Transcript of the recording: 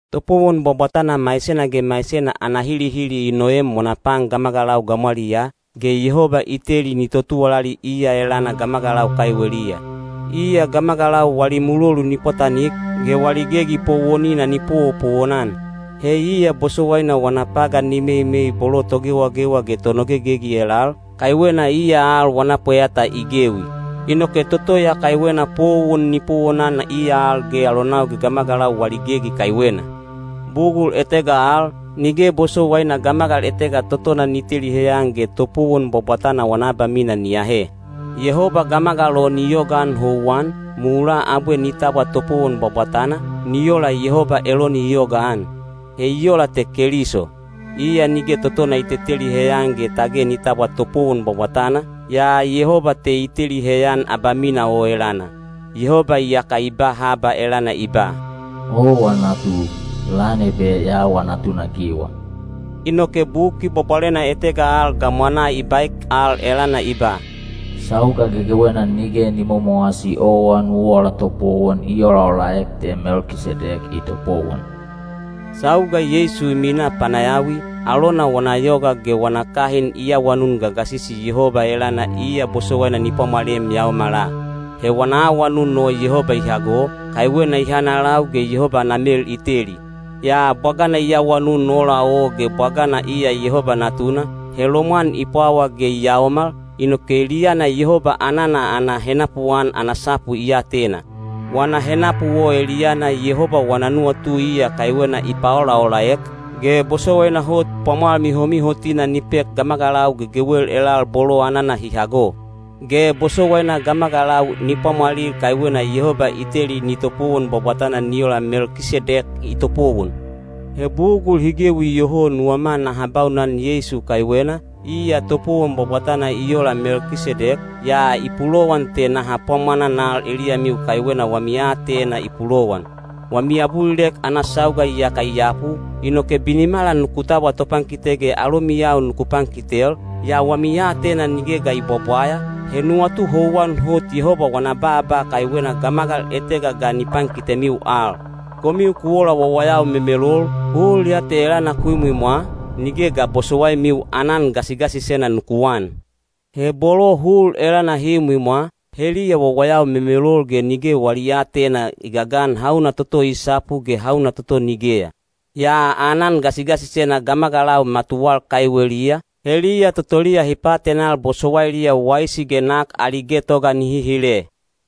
Topowon bwabwatana maisena ge maisena ana hilihili i noem wana pan gamagalau gamwaliyaa, ge Yehoba i teli ni totuwalali iya elana gamagalau kaiweliya. Iya gamagalau wali mulolu ni pwatanik, ge wali gegi powonina ni powopowon-an. He iya bosowaina wana pagan ni meimei bolo togewagewa ge tonogegegi elal, kaiwena iya al wana pweyata i gewi. Inoke toto ya kaiwena powon ni powonan iya al ge alonau ge gamagalau wali gegi kaiwena. Bugul etega al, nige bosowaina gamagal etega totona ni teli heyan ge topowon bwabwatana wana abamina ni ahe. Yehoba gamagal o ni yogaan houwan, mulaa abwe ni tabwa topowon bwabwatana, ni ola Yehoba Eloni i yogaan. He i ola te Keliso. Iya nige totona i teteli heyan ge tage ni tabwa topowon bwabwatana, yaa Yehoba te i teli heyan abamina o elana. Yehoba iyaka i ba haba elana i ba: “Owa natu; lan ebe ya awa natunagiwa.” Inoke Buki Bwabwalena etega al gamwanaa i baek al elana i ba, “Sauga gegewena nige ni momowasi owa nu ola topowon i olaolaek te Melkisedek i topowon.” Sauga Yeisu i minaa panayawi, alona wana yoga ge wana kahin i awanun gagasisi Yehoba elana iya bosowaina ni pwamwalem yaomala. He wana awanun o Yehoba i hago, kaiwena i hanalau ge Yehoba ana mel i teli. Yaa bwagana i awanun ola o ge bwagana iya Yehoba Natuna, he lomwan i pwawa ge i yaomal, inoke eliyana Yehoba anana ana henapuan ana sapu i atena. Wana henapu o eliyana Yehoba wana nuwatu iya kaiwena i paolaolaek, ge bosowaina hot pwamwal mihomihotina ni pek gamagalau gegewel elal bolo anana hi hago. Ge bosowaina gamagalau ni pwamwalil kaiwena Yehoba i teli ni topowon bwabwatana ni ola Melkisedek i topowon. He bugul hi gewi iyoho nuwama naha baunan Yeisu kaiwena, iya topowon bwabwatana i ola Melkisedek, yaa i pulowan te naha pwamwananal eliyamiu kaiwena wami aatena i pulowan. Wami abulilek ana sauga iyaka i yapu, inoke binimala nuku tabwa topankite ge alomiyau nuku pankitel, yaa wami aatena nige ga i bwabwaya, he nuwatu houwan hot Yehoba wana baaba kaiwena gamagal etega ga ni pankitemiu al. Komiu ku ola wawayau memelol, hul ya te elana ku imwimwa, nige ga bosowaimiu aanan gasigasisena nuku an. He bolo hul elana hi imwimwa, heliya wawayau memelol ge nige wali aatena i gagan hauna toto i sapu ge hauna toto nigeya. Yaa aanan gasigasisena gamagalau matuwal kaiweliya, heliya totoliya hi paatenal bosowailiya waisi ge nak ali getoga nihi hile.